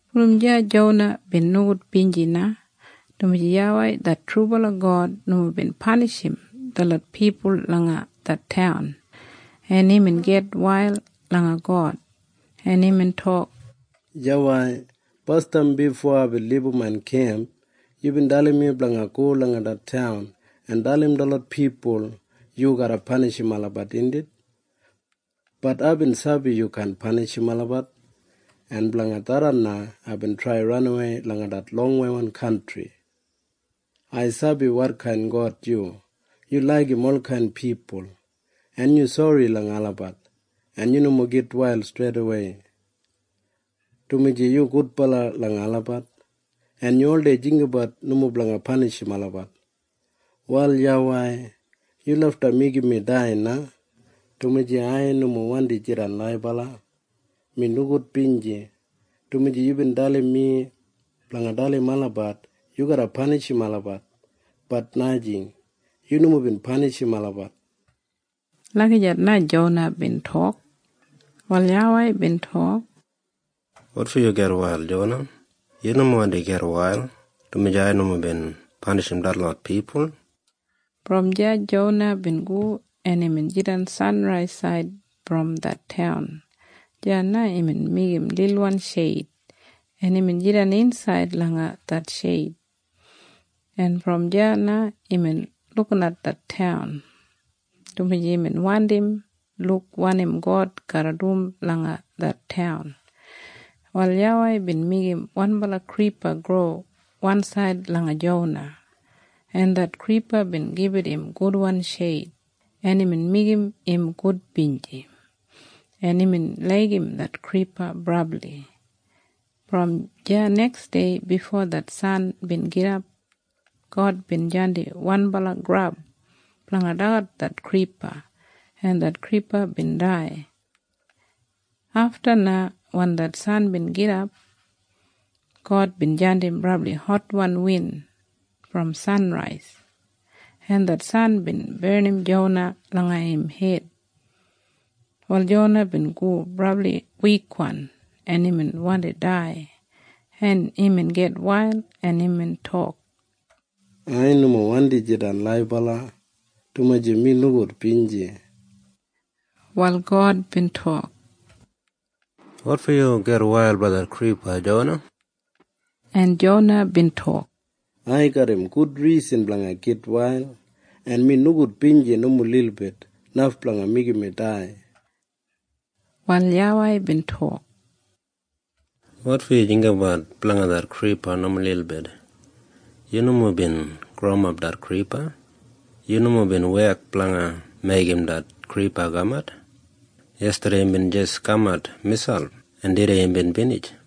Brom deya Jona bin nogudbinji na, dumaji YAWEI det trubala God nomo bin panishim detlot pipul langa det taun. En imbin gitwail langa God, en imbin tok, “YAWEI, basdam bifo aibin libum main kemp yubin dalim mi blanga go langa det taun en dalim detlot pipul yu garra panishim olabat, indit? Bat aibin sabi yu kaan panishim olabat. En blanga tharran na aibin trai ranawei langa det longweiwan kantri. “Ai sabi wotkain God yu. Yu laigim olkain pipul, en yu sori langa olabat, en yu nomo gitwail streidawei, dumaji yu gudbala langa olabat, en yu oldei jinggabat nomo blanga panishim olabat. “Wal YAWEI, yu lafta meigim mi dai na, dumaji ai nomo wandi jidan laibala. Mi nogudbinji, dumaji yubin dalim mi blanga dalim olabat yu garra panishim olabat. Bat najing. Yu nomo bin panishim olabat.” Lagijat na Jona bin tok. Wal YAWEI bin tok, “Wotfo yu gitwail, Jona? Yu nomo wandi gitwail dumaji ai nomo bin panishim detlot pipul.” Brom deya Jona bin go en imbin jidan sanraisaid brom det taun. Deya na imbin meigim lilwan sheid, en imbin jidan insaid langa det sheid. En brom deya na imbin lukinat det taun, dumaji imbin wandi luk wanim God garra du langa det taun. Wal YAWEI bin meigim wanbala kripa gro wansaid langa Jona, en det kripa bin gibit im gudwan sheid, en imbin meigim im gudbinji, en imbin laigim det kripa brabli. Brom deya neksdei bifo det san bin gidap, God bin jandim wanbala grab blanga dagat det kripa, en det kripa bin dai. Afta na wen det san bin gidap, God bin jandim brabli hotwan win brom sanrais, en det san bin barnim Jona langa im hed. Wal Jona bin go brabli wikwan, en imbin wandi dai, en imbin gitwail, en imbin tok, “Ai nomo wandi jidan laibala, dumaji mi nogudbinji.” Wal God bin tok, “Wotfo yu gitwail blanga det kripa, Jona?” En Jona bin tok, “Ai garram gud risan blanga gitwail, en mi nogudbinji nomo lilbit, naf blanga meigim mi dai.” Wal YAWEI bin tok, “Wotfo yu jinggabat blanga det kripa nomo lilbit? Yu nomo bin growimap det kripa. Yu nomo bin wek blanga meigim det kripa kamat. Yestadei imbin jis kamat miselp, en tudei imbin binij.